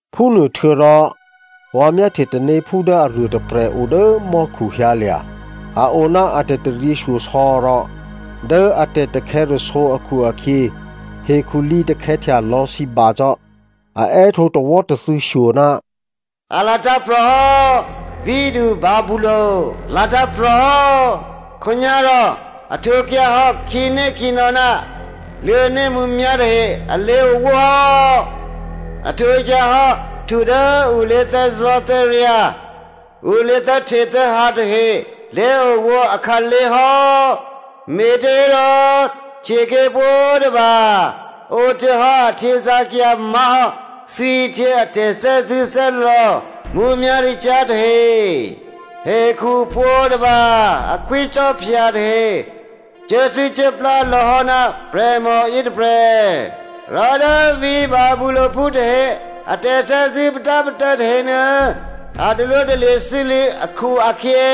Phúnuôhtuô̌rò vǎ myáhtye tanéphú dố aruô tôprè̤ o dố mò́khu hyǎlya̤. A o ná a tè̤taryěshyosò̌ rò dố a tè̤takhè̌rasǒ akhu-akhyě hekhu lǐtakhè̌htya lò̌ sǐba cò́. A è́htǒ tawò́tathû̌ shyo, “A latǎ̤prò̤ hò́, vǐ̤du Babylonia latǎ̤prò̤ hò́. Khǒnyá̤rò a htwǒkyǎ hò́ khǐnékhǐnò̌ ná luô̤̌né mǔmyá̤ tahe a lé̤owó hò́. A htwǒkyǎ hò́ htu dố ǔ lé̤thè́zò̤́thè́ryǎ̤, ǔ lé̤thè́htethè́hǎ tahe lé̤owó akhǎlé̤ hò́. Me̤těhérò htyěké̤ pwǒ̤tôba ǒhtuô̌hò́ a htyězǎ̤cyǎ má̤hò́ thwihtyě a tè̤thè́zṳ̂́thè́lò̌ mǔmyá̤ricyá̤ tahe. Hekhu pwǒ̤tôba a khwícò́phya tahe cuốthû́cuốplá lò̌ hò́ ná prè̤mò yětôprè̤, rò dố vǐ̤ Babyloniaphú tahe a tè̤thè́zṳ̂́ patápatô̌ tahenuô, a talwótalye̤ sû́lû̌ akhu-akhyě,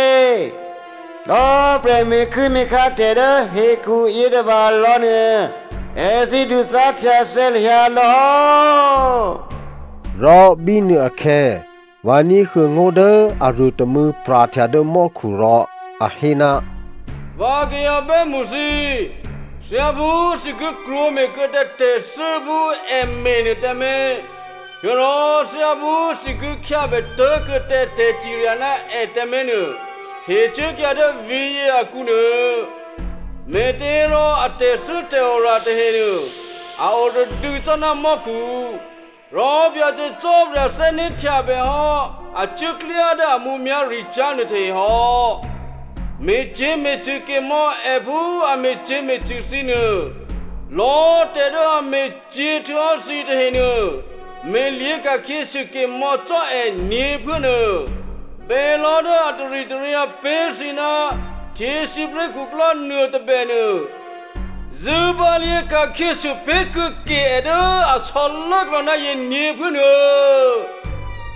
lò̌꤮ prè̤ me̤kuố̤me̤khá tè̤ dố hekhu yětôbalò̌ nuô, èthǐ duzá̤htyathè̌ hyǎlò̌ hò́.” Rò bínuôakhè̌ vǎ ní̤huô̌ ngó̤ dố aruô tômû̌ pra̤htya dố mò́khu rò a hé, “Vǎ kayǎ bè́mṳ thǐ꤮, thyáphú thǐ ki krwǒme̤ kuô̌ tǎ tè̤thû́ phú è me̤ nuô tǎmé̤, htuô̌rò thyáphú thǐ ki khyábè tố̤kuô̌ tǎ tè̤cirya ná è tǎmé̤ nuô, htecuốkyǎ dố vǐ̤yě akǔ nuô. Me̤těhérò a tè̤thû́tè̤ora tahenuô, a oradû̌ cò́ ná mò́khu, rò Byacè Cò́marya thè́né̤htyabè hò́ a cuốklyá dố a mǔmyá̤ricyá̤ nuôtahe hò́. Me̤cyě̤me̤cṳ̂ ke mò̌ è phú a me̤cyě̤me̤cṳ̂ thǐ nuô, lò̌꤮ tè̤ dố a me̤cyě̤ htuô̌hò́ thǐ tahenuô, me̤lyě̤ ka̤khyěsû ke mò̌ cò́ è nyě̤phuố nuô. Bělò̤́ dố a taritaryǎ pé̤ thǐ ná htyěsípré̤khuklò́ nuôtôbè nuô, zṳ̂bǎlyě̤ ka̤khyěsû pé̤kuô̌ ke è dố a sò̌lốklò̌ ná yě nyě̤phuố nuô.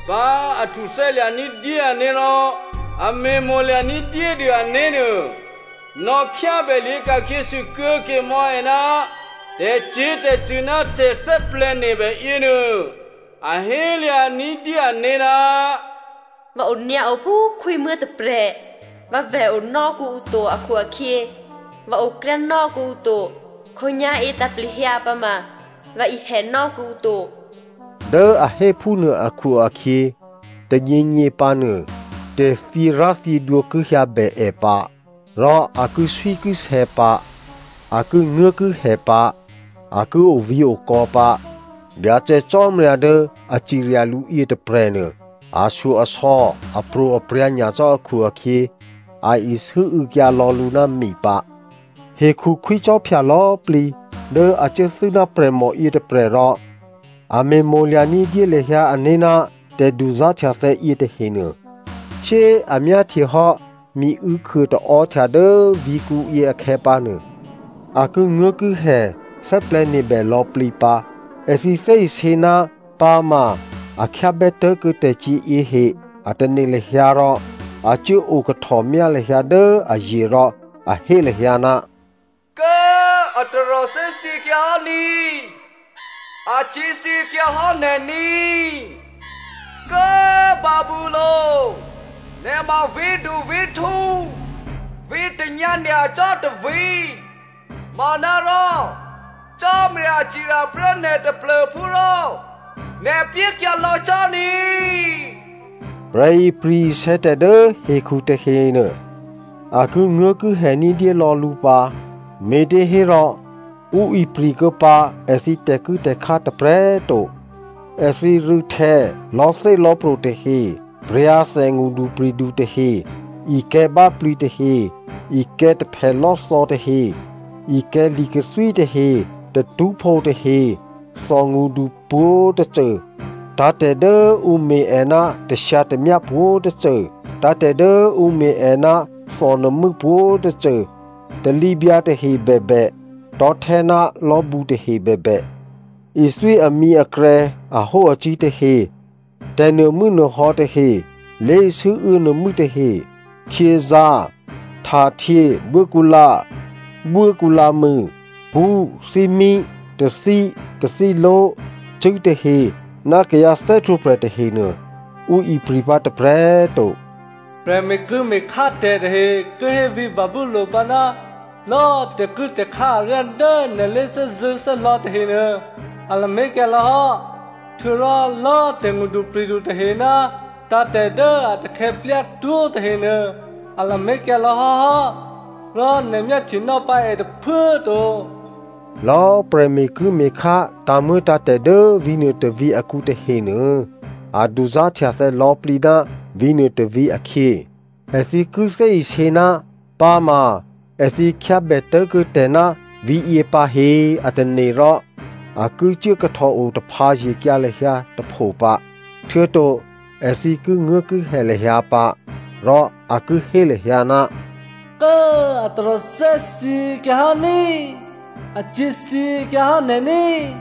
Bá꤮ a htuthè́lya̤ ní̤dyé ané̤ rò a me̤mo̤lya̤ ní̤dyédû ané̤ nuô, nò̌khyábè lyě̤ka̤khyě sûkuô̌ ke mò̌ è ná tè̤cyě̤tè̤cṳ̂ ná tè̤thè́plè̤̌nebè yěnuô. A hélya̤ ní̤dyé ané̤, ‘Vǎ onyǎo phú khwímuố̤ tôprè̤, vǎvè̤ onò́ kuô̌ǔ to akhu-akhyě, vǎ okryá nò́ kuô̌ǔ to, khǒnyá̤yě tǎ̤plehyǎ pǎma, vǎ ihè nò́ kuô̌ǔ to.’ Dố a hé phúnuô akhu-akhyě, tônyěnyě pǎ nuô, tè̤thyěrá̤thyědwǒ ki hyǎbè è pǎ, rò a kiswíkisè̌ pǎ, a kinguố̤kihè pǎ, a ki ovǐ̤okò̌ pǎ. Byacè Cò́marya dố a cirya lǔ yětôprè̤nuô ashyo-asò̌, apro̤aprya̤ nyacò́ akhu-akhyě, a isû́û̌kyǎ lò̌ lǔ ná mi pǎ.” “Hekhu khwícò́phya lò̌꤮ plǐ dố a cuốthû́ ná prè̤mò yětôprè̤ rò a me̤mo̤lya̤ ní̤dyé lahyǎ ané̤ ná tè̤duzá̤htyathè̌ yětahenuô, shyé꤮ a myáhtyehò́ miû̌khuô taò́htya dố vǐ̤kǔyě akhè̌pǎnuô, a kinguố̤kihè thè́plè̤̌nebè lò̌plǐ pǎ. Èthǐ thè́isě ná pǎma a khyábè tố̤kuô̌ tè̤cyě̤yě he꤮ a tane̤ lahyǎ rò a cuốo kahtòmyá lahyǎ dố aye̤ rò a hé lahyǎ, ‘Kố꤮ a taròthè́ thyěkyǎ hò́ ní꤮, acyě̤ thyěkyǎhò́ nè̤ ní꤮, Kố꤮ Babylonia, nè̤ ma vǐ̤duvǐ̤htǔ, vǐ̤tanyǎ nyacò́ tôvǐ̤ manárò Cò́marya cirya prè́ nè̤ taplô̤phú rò nè̤ pyékyǎ lò̌ cò́ ní꤮.’ “Prè̤ ipri̤-isè̌ tè̤ dố hekhu tahenuô, a kinguố̤kihè ní̤dyé lò̌ lǔ pǎ, me̤těhérò ǔ ipri̤kuô̌ pǎ èthǐ tè̤kuố̤tè̤khá tôprè̤꤮ to. Èthǐ rû̌htè̌, lò̤́thélò̤́pro̤ tahe, pra̤thè ngṳdupri̤du tahe, ikè̤̌ báplǐ tahe, ikè̤̌ taphèlò́thò̌ tahe, ikè̤̌ li̤kathwí tahe, tatṳ́phǒ tahe, thòngṳdu pwǒ̤tôcô, tǎ̤tè̤ dố ǔ me̤ è ná tashyǎtamyá pwǒ̤tôcô, tǎ̤tè̤ dố ǔ me̤ è ná thònuô̤mû́ pwǒ̤tôcô, talǐbyǎ tahe bèbè, tò̤́htè́ ná lò̤́bǔ tahe bèbè, ithwí amǐakrè̌ ahóacǐ̤ tahe, tè̤nuô̤mû́nuô̤sû̌ tahe, lé̤sû́û̌ nuô̤mû́ tahe, htyězǎ̤, htahtyě, buốkǔlǎ, buốkǔlǎmû, pṳ́, thímí, tathí, tathíló̤, cṳ̂́tahe ná kayǎ thè́htwǒprè̤ tahenuô ǔ ipri̤ pǎ tôprè̤꤮ to. “Prè̤ me̤kuố̤me̤khá tè̤ tahe ki hé vǐ̤ Babylonia pǎ, ‘Lò̌꤮ tè̤kuố̤tè̤khá aryá dố nè̤ lé̤thè́zṳ̂́thè́lò̌ tahenuô, a lamé̤kyǎ lò̌hò́. Htuô̌rò lò̌꤮ tè̤ngṳdupri̤du tahe ná tǎ̤tè̤ dố a takhè̌ plyatwó̤ tahenuô, a lamé̤kyǎ lò̌ hò́hò́, rò nè̤ myáhtyenò́ pǎ è tôphuố꤮ to.’ Lò̌ prè̤me̤kuố̤me̤khá tǎ̤muô̌tǎ̤tè̤ dố vǐ̤nuô tôvǐ̤ akǔ tahenuô, a duzá̤htyathè̌ lò̌plǐ ná vǐ̤nuô tôvǐ̤ akhyě. Èthǐ ki thè́isě ná pǎma èthǐ khyábè tố̤kuô̌ tè̤ ná vǐ̤yě pǎ he a tane̤ rò a ki cuố kahtòo taphǎye̤kyǎ lahyǎ tôpho pǎ, htuô̌to èthǐ kinguố̤kihè lahyǎ pǎ, rò a ki hé lahyǎ, ‘Kố꤮ a taròthè́ thyěkyǎ hò́ ní꤮, acyě̤ thyěkyǎ hò́ nè̤ ní꤮.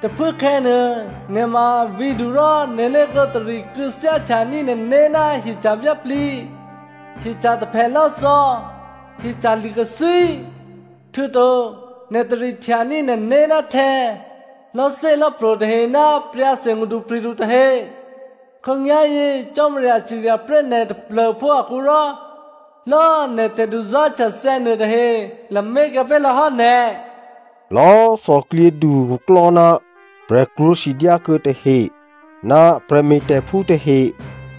Tôphuốkhè̌nuô, nè̤ ma vǐ̤du rò nè̤ lé̤klǒ tari kû̌thyáhtyaní̤ nè̤né̤ ná hyeca̤ báplǐ, hyeca̤ taphèlò́thò̌, hyeca̤ li̤kathwí, htuô̌to nè̤ tarihtyaní̤ nè̤né̤ ná htè̌, lò̤́thélò̤́pro̤ tahe ná pra̤thè ngṳdupri̤du tahe. Khǒnyá̤yě Cò́marya ciryaprè́ nè̤ taplô̤phú akǔ rò, lò̌꤮ nè̤ tè̤duzá̤htyathè̌ nuôtahe lamé̤kyǎ pé̤lò̌ hò́ nè̤.’ “Lò̌꤮ thòklyědu khuklò́ ná prè̤krwǒ sidyákuô̌ tahe ná prè̤me̤tè̤phú tahe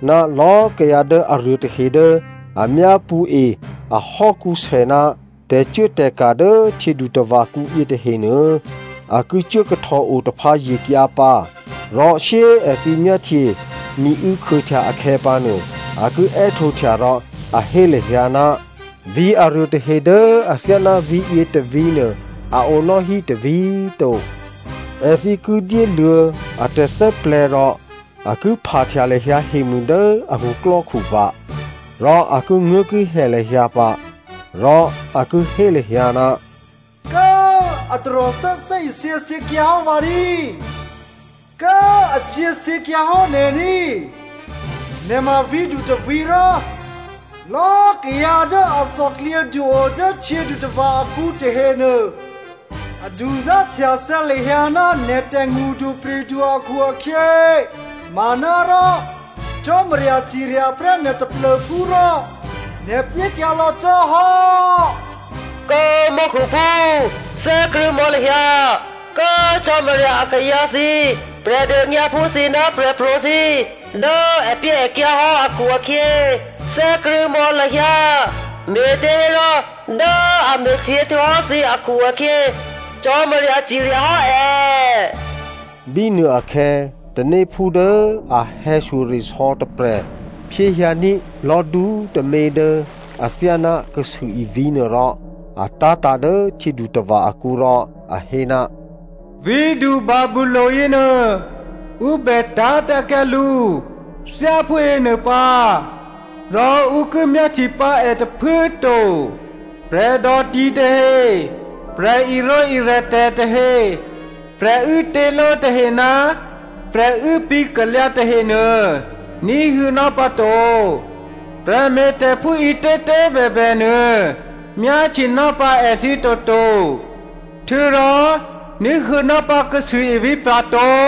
ná lò̌꤮ kayǎ dố aruô tahe dố a myápṳ̌e ahò́kǔsè ná tè̤cuốtè̤ka̤ dố htyědutava̤kǔ yětahenuô, a ki cuố kahtòo taphǎye̤kyǎ pǎ. Rò shyé꤮ èthǐ myáhtye miû̌ khuôhtya akhè̌pǎnuô a ki è́htǒhtya rò a hé lahyǎ, ‘Vǐ̤ aruôtahe dố athyáná vǐ̤yě tôvǐ̤ nuô a o nò́hí tôvǐ̤꤮ to.’ Èthǐ ki dyéluô̌ a tè̤thè́plè̤̌ rò a ki phahtya lahyǎ hemû dố a khuklò́khu pǎ, rò a kinguố̤kihè lahyǎ pǎ, rò a ki hé lahyǎ, ‘Kố꤮ a taròthè́ thè́isě thyěkyǎ hò́ vǎ ní꤮, Kố꤮ acyě̤ thyěkyǎ hò́ nè̤ ní꤮. Nè̤ ma vǐ̤du tôvǐ̤ rò, lò̌꤮ kayǎ dố a thòklyědu o dố htyědutava̤ akǔ tahenuô, a duzá̤htyathè̌ lahyǎ ná nè̤tè̤ ngṳdupri̤du akhu-akhyě manárò, Cò́marya ciryaprè́ nè̤ taplô̤phú rò, nè̤ pyékyǎ lò̌ cò́ hò́. Kố꤮ mò́khuphú thè́krṳ̂̌mò̌ lahyǎ, Kố꤮ Cò́marya akayǎ thǐ, Prè̤dônyǎphú thǐ ná prè̤pro̤ thǐ꤮, dố èpyéèkyǎ hò́ akhu-akhyě, thè́krṳ̂̌mò̌ lahyǎ. Me̤těhérò dố a me̤cyě̤ htuô̌hò́ thǐ akhu-akhyě Cò́marya ciryahò́ è.’” Bínuôakhè̌ tanéphú dố a hè̌shyoresò̌ tôprè̤ phyéhyǎní̤ lò̤́du꤮ tômě dố athyáná kasûivǐ̤ nuôrò a tá̤tǎ̤ dố htyědutava̤ akǔ rò a hé, “Vǐ̤du Babylonia yěnuô, ǔ bè tá̤tǎ̤kyǎ lǔ thyáphú yěnuô pǎ rò ǔ ki myáhtye pǎ è tôphuố꤮ to. Prè̤dò ti tahe, prè̤irǒirè tè̤tahe, prè̤uố těló tahe ná prè̤uố píkalyǎ tahenuô ní̤huô̌nò́ pǎto. Prè̤me̤tè̤phú ǐtětě꤮ bèbènuô myáhtyenò́ pǎ èthǐ toto. Htuô̌rò ní̤huô̌nò́ pǎ kasûivǐ̤ pra̤ to.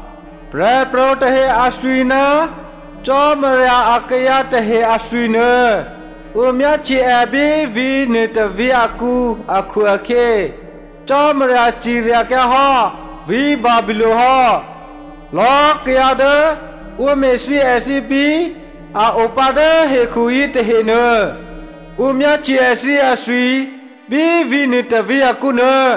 Prè̤pro̤ tahe athwi ná Cò́marya akayǎ tahe athwi nuô ǔ myáhtye è bí vǐ̤nuô tôvǐ̤ akǔ akhu-akhyě, Cò́marya ciryakyǎ hò́ vǐ̤ Babylonia hò́. Lò̌꤮ kayǎ dố ǔ me̤thyě èthǐ bí a o pǎ dố hekhu yětahenuô, ǔ myáhtye èthǐ athwi bí vǐ̤nuô tôvǐ̤ akǔnuô.”